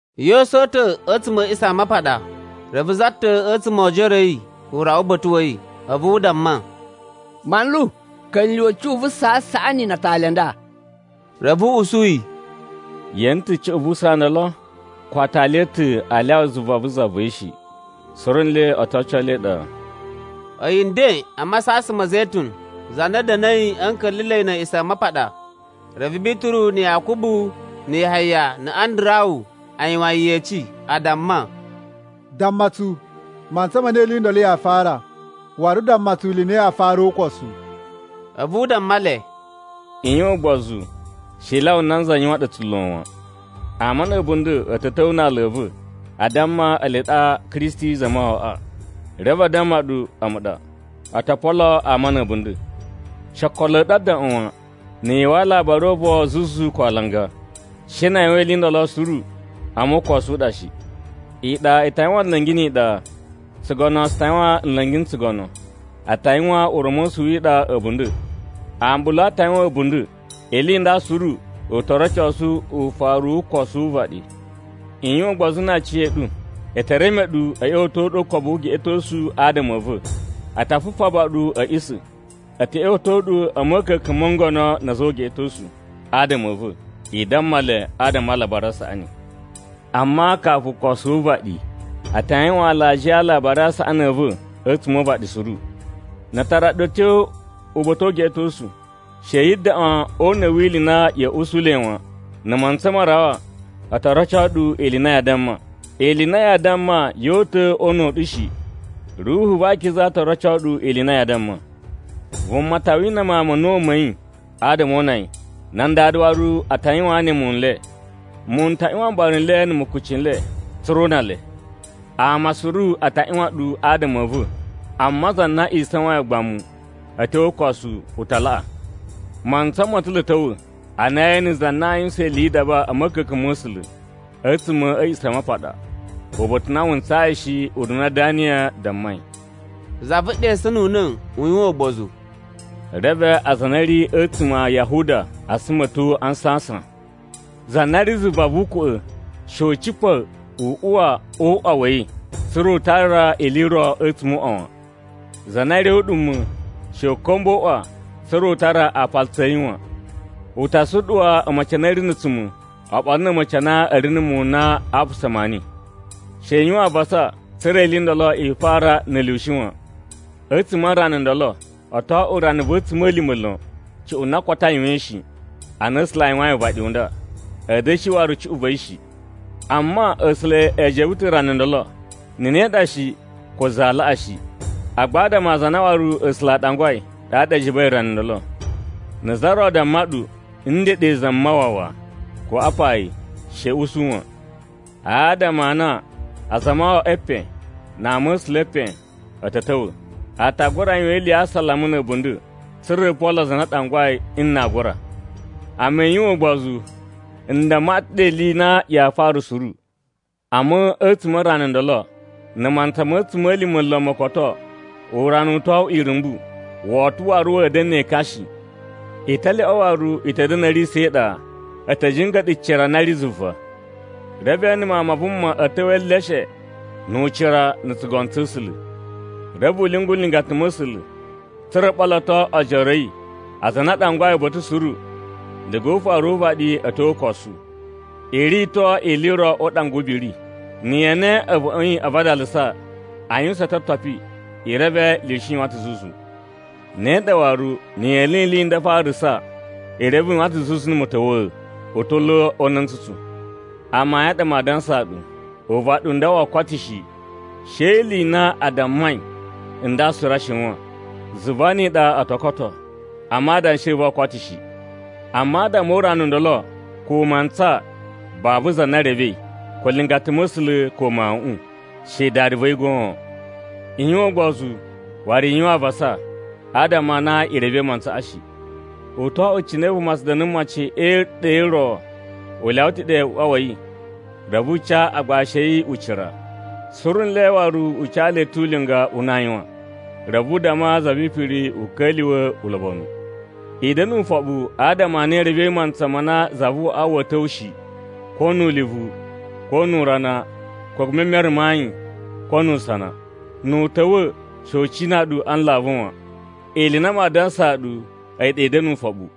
Yesu o uta̱ a̱ A̱a̱ꞌisamapaɗa, reve za ta̱ a̱tsuma̱ o ojoro a̱ yi u rawa uba̱ta̱ wa̱ yi, a̱vu u damma, “Manlu, ka̱lyuwa̱ cuꞌun vu usaa u saꞌani na atali a nda!” Reve u usu yi, “Ye ene ta̱ cuꞌun vu usaa ndolo? Ko aatali a̱ ta̱ aa lyawa zuva vu za va̱ yi shi. Suru nle o to oco le e iɗa.” A̱yi nden a masasan ma̱ Zetun za na da̱na̱i a̱ nka̱la̱la̱i na̱ A̱a̱ꞌisamapaɗa, reve Bituru na̱ Yakubu na̱ Yahaya na̱ Andarawu a yuwan yi yeci. A damma, “Damma tsu mantsa ma na ili i ndolo yaa fara. Waru damma tsu ili i na yaa fara o ukosu.” A̱vu u damma le, “I yuwan ugbozu she i lyawa nanza yuwan ɗu tsulo wan. Ama na̱ a̱bunda̱ a̱ ta̱ ta̱wa̱ na aala a̱ va̱ a damma ele ɗa Kristi Zamawawaꞌa. Reve a damma ɗu, ‘A̱mu ɗa,’ o to polo ama na̱ a̱bunda̱. She okolo a̱ ɗu a daꞌwan wan, na̱ yu uwwa alabari o uvon zuzu ko alanga. She na a yuwan ili i ndolo suru, amma ukosu u ɗa shi. Iɗa i ta yuwan nla̱ngi ni iɗa. Tsugono tsu ta yuwan nla̱ngi na̱ tsugono. A ta yuwan ura̱mosu wi iɗa a̱bunda̱. Ambulu a ta yuwan a̱bunda̱. Ili i nda suru u to rocosu ufaru wu ukosu wu uvaɗi. “I yuwan ugbozu na aciya̱ɗu. E te reme ɗu a̱ ꞌya̱wa̱to ɗu o ukobu wu ugeꞌetosu adama a̱ va̱. A ta fufaba ɗu a̱ a̱ꞌisa̱. A̱ ta̱ ꞌya̱wa̱to ɗu a̱ ma̱ka̱ka̱n mo ngono na̱ a̱za̱ o ugeꞌetosu, adama a̱ va̱. I damma le adama a Alabari a Saꞌani. Amma kafu ukosu wu uvaɗi, a ta yuwan alajiya a Alabari a Saꞌani a̱ va̱ a̱tsuma̱ o uvaɗi suru. Na a tara ɗu a̱ tyo uba̱ta̱ o ugeꞌetosu, she yi daꞌwan o una̱ wi ili i na ya̱a̱ usu le wan. Na̱ mantsa ma rawa, o to roco ɗu ili i na yaa damma. Ili i na yaa damma yoo uta̱ o una̱ u ɗu shi, Ruhu va akiza to roco ɗu ili i na yaa damma. “Vuma ta wina mawun ma̱ a̱na̱wu ma̱ yi adama o una yi. Nan dada waru a ta yuwaan ne muwun n le. Muwun n ta ꞌyuwan mbara n le na̱ mukuci n le, tsa̱ra̱ o una le. Ama suru a ta ꞌyuwan ɗu adama a̱ va̱. Amma za na isawain ugbamu, a̱ tyo o ukosu u ta laꞌa. “Mantsa ma̱ ta̱ lo a̱ ta̱wa̱ a na yee ene za na a yuwusan ili yi idaba a̱ ma̱ka̱ka̱n ma̱ A̱sula̱ a̱tsuma̱ a̱ A̱a̱ꞌisamapaɗa, uba̱ta̱ u na wu ntsayi shi ununa Daniyan dammai.” (Za vu ɗesununa̱ u yuwan ugbozu.) “Reve aza a na a̱ ri a̱tsuma̱ a Yahuda a suma a̱ tyo a nsasan. Za na ri zuva vu ukwa̱ꞌa̱, she u cipa̱ u uwa o uꞌwa wa̱ yi, tsa̱ra̱ u tara ili i ro a̱tsuma̱ o uꞌwa wan. Za na ri ɗe o uɗuma̱, she u ka̱mba̱ o uꞌwa, tsa̱ra̱ u tara aapalutsu a̱ yi wan. U ta suɗuwa a̱ma̱ci a na a̱ ri na̱ a̱tsuma̱ oɓolo na̱ a̱ma̱ci a na a̱ ri na̱ muwun n na ma apasa maani. “She i yuwan avasa, tsa̱ra̱ ili i ndolo i fara na̱ lyushi wan. A̱tsuma̱ a rana ndolo, o to oꞌwo rana va̱ a̱tsuma̱lima̱ lon, cuꞌun na koto a yuwain shi, ana A̱sula̱ a yuwain uvaɗi u nda. A̱ da̱shi waru cuꞌun va̱ yi shi. Amma A̱sula̱ e jebe ta̱ rana ndolo, na̱ ne ɗa shi, ko za aa laꞌa shi. Agba adama a aza a na waru A̱sula̱ a ɗangwai, ɗaɗa e jebei rana ndolo. “Na̱ za ro damma ɗu, ‘Ndeɗe Zamawawa,’ ko ‘Apa yi,’ she i usu wan. Adama a na azamawawa e epen na ama̱sula̱ e epen, a̱ ta̱ ta̱wa̱. A ta gura yuwan ili ya asalama na̱ a̱bunda̱, tsa̱ra̱ o polo aza a na a ɗangwai n na aa gura. Amma i yuwan ugbozu n damma ɗu ta̱ ɗe ili i na yaa fara suru. “Amma a̱tsuma̱ a rana ndolo, na̱ mantsa ma̱ a̱tsuma̱lima̱ lon mo koto, urana u to oꞌwo irumbu, woto waru wa̱a̱ da̱na̱ ne ekan shi. Italyoꞌo waru i ta̱ da̱na̱ a̱ riya̱sa̱ e iɗa. A̱ ta̱ jinga̱ɗa̱ cira na ri zuva. Reve ee ene Mawun ma Vuma a̱ ta̱wa̱ e eleshe nu ucira na̱ tsugono tsa̱ A̱sula̱. Reve u lyungu nlingata ma̱ A̱sula̱, tsa̱ra̱ o ɓoloto ojoro a̱ yi, aza a na u ɗangwai uba̱ta̱ suru, diga o ufaru wu uvaɗi a̱ tyo o ukosu. “I rito ili i ro o uɗanga wu ubiri. Na̱ yee ene a̱vuꞌun a̱ yi a vadalasa, a yuwusan ototopi, i reve lyushi yuwan ta̱ zuzu. Ne ɗa waru na̱ yee ene ili i nda a farasa, i reve u yuwan ta̱ zuzu na̱ ma̱ta̱wa̱a̱, u ta̱ lo o una̱ntsutsu. Amayun a ɗa maa dansaa ɗu, uvaɗi u nda woo koto shi, she ni ili i na a dammai nda suru a shiwan. Zuva ni iɗa o to koto, amma adanshi a̱ va̱ oo koto shi. “Amma adama o urana u ndolo, ko mantsa babu za na revei, ko nlingata ma̱ A̱sula̱, ko Mawuꞌun, she Dada va̱ yi goon. I yuwan ugbozu waru i yuwan avasa adama a na i revei mantsaꞌa shi. “U to oꞌwo cine vuma tsu da̱na̱ mocin e iɗa i ro u lyawa ta̱ ɗe uꞌwa wa̱ yi, reve u ca agbashi a̱ yi ucira, suru nle waru u ca le ta̱ ulinga u na aa yuwan. Reve u damma za vi ipiri u ka̱lyuwa̱ ulobonu. I da̱na̱ ufoɓu adama a na i revei mantsa ma na zavuꞌwaꞌa wa̱a̱ ta̱wa̱ shi. Ko nu ulivu, ko nu urana, ko e memere ma ayin, ko nu usana. Nu u ta̱wa̱ she u cina ɗu a nlavu wan. Ili i na maa dansaa ɗu, a̱yi ɗa i da̱na̱ ufoɓu.”